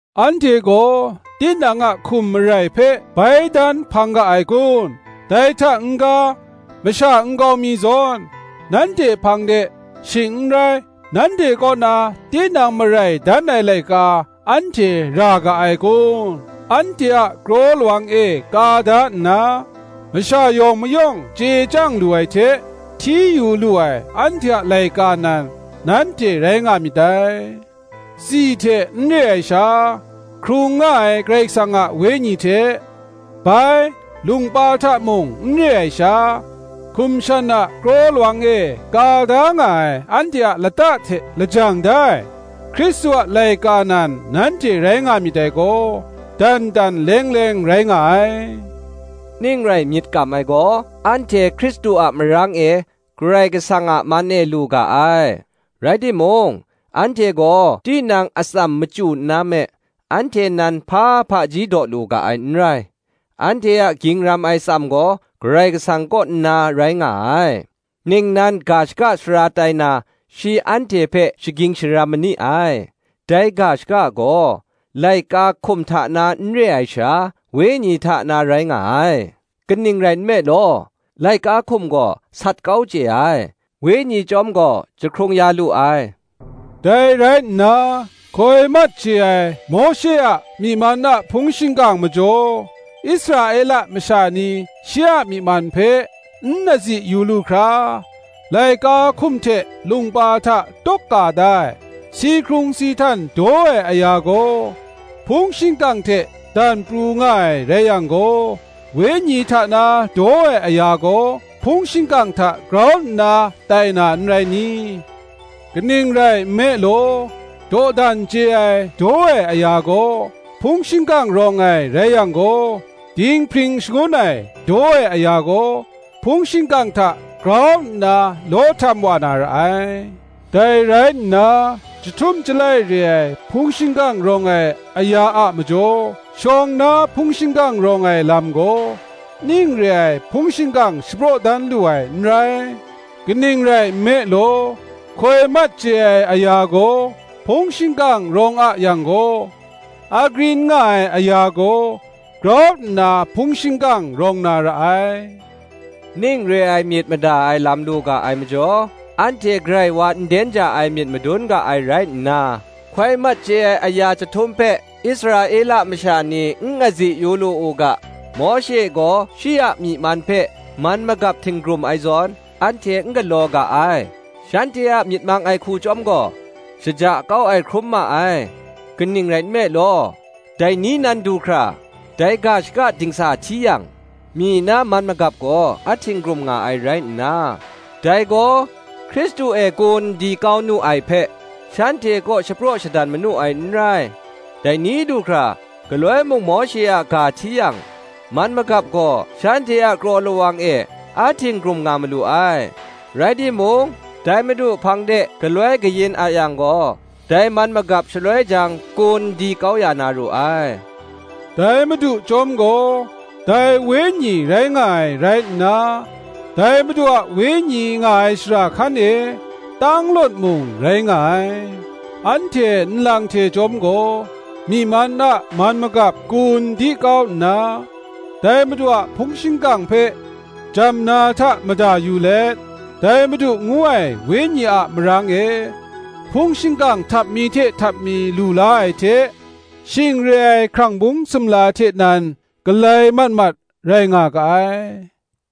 Anhte gaw tinang a hkum marai hpe bai dan hpang ga ai kun? dai hta n-ga, masha nkau mi zawn nanhte hpang de, shing n rai nanhte kaw na tinang marai dan ai laika anhte ra ga ai kun? Anhte a kraw lawang e ka da nna, masha yawng mayawng chye chyang lu ai hte hti yu lu ai anhte a laika nan, nanhte rai nga myit dai: tsi hte n re ai sha, hkrung nga ai Karai Kasang a Wenyi hte, bai, lungpa hta mung n re ai sha, hkum shan a kraw lawang e ka da nga ai, anhte a lata hte lajang da ai Hkristu a laika nan nanhte rai nga myit dai gaw, dan dan leng leng rai nga ai. Ning rai myit kam ai gaw, anhte Hkristu a marang e Karai Kasang a man e lu ga ai. Rai timung, anhte gaw tinang atsam machyu nna me, anhte nan hpa hpaji daw lu ga ai n rai; anhte a ging ram ai atsam gaw Karai Kasang kaw nna rai nga ai; ningnan ga shaka sara tai na shi anhte hpe shaging sharam ma ni ai; dai ga shaka gaw, laika hkum hta na n re ai sha, Wenyi hta na rai nga ai: kaning rai nme law, laika hkum gaw sat kau chye ai, Wenyi chyawm gaw jahkrung ya lu ai. Dai rai nna, hkoi mat chye ai Mawshe a myi man a hpung shingkang majaw, Israela masha ni shi a myi man hpe n azi yu lu hkra, laika hkum hte lungpa hta tawk ka da ai, si hkrung si htan daw ai aya gaw, hpung shingkang hte dan pru nga ai rai yang gaw, Wenyi hta na daw ai aya gaw, hpung shingkang hta grau nna tai na, n rai ni? Kaning rai nme law, dawdan chye ai daw ai aya gaw hpung shingkang rawng ai rai yang gaw, dinghpring shangun ai daw ai aya gaw hpung shingkang hta grau nna law htam wa na ra ai. Dai rai nna, chyahtum chyalai re ai hpung shingkang rawng ai aya a majaw, shawng na hpung shingkang rawng ai lam gaw, ning re ai hpung shingkang shapraw dan lu ai n rai. Kaning rai nme law, hkoi mat chye ai aya gaw hpung shingkang rawng a yang gaw, agrin nga ai aya gaw grau nna hpung shingkang rawng na ra ai. Ning re ai myit mada ai lam lu ga ai majaw, anhte grai wa nden ja ai myit madun ga ai rai nna, hkoi mat chye ai aya jahtum hpe Israela masha ni n azi yu lu u ga, Mawshe gaw shi a myi man hpe man magap htinggrum ai zawn, anhte n galaw ga ai. Shanhte a myit mang ai hku chyawm gaw shaja kau ai hkrum ma ai; kaning rai nme law, dai ni nan du hkra, dai ga shaka dingsa hti yang, myi na man magap gaw a htinggrum nga ai rai nna, dai gaw Hkristu e kun di kau nu ai hpe, shanhte kaw shapraw shadan manu ai n rai: dai ni du hkra, galoi mung Mawshe a ga hti yang, man magap gaw shanhte a kraw lawang e a htinggrum nga malu ai. Rai timung, dai Madu hpang de galoi tim kayin a yang gaw, dai man magap shaloi jang kun di kau ya na ru ai. Dai Madu chyawm gaw dai Wenyi rai nga ai rai nna, dai Madu a Wenyi nga ai shara hkan e shanglawt mung rai nga ai. Anhte nlang hte chyawm gaw myi man a man magap kun di kau nna, dai Madu a hpung shingkang hpe jamna hta mada yu let, dai Madu ngu ai Wenyi a marang e, hpung shingkang htap mi hte htap mi lu la ai hte, shing re ai hkrang bung sumla hte nan galai mat mat rai nga ga ai.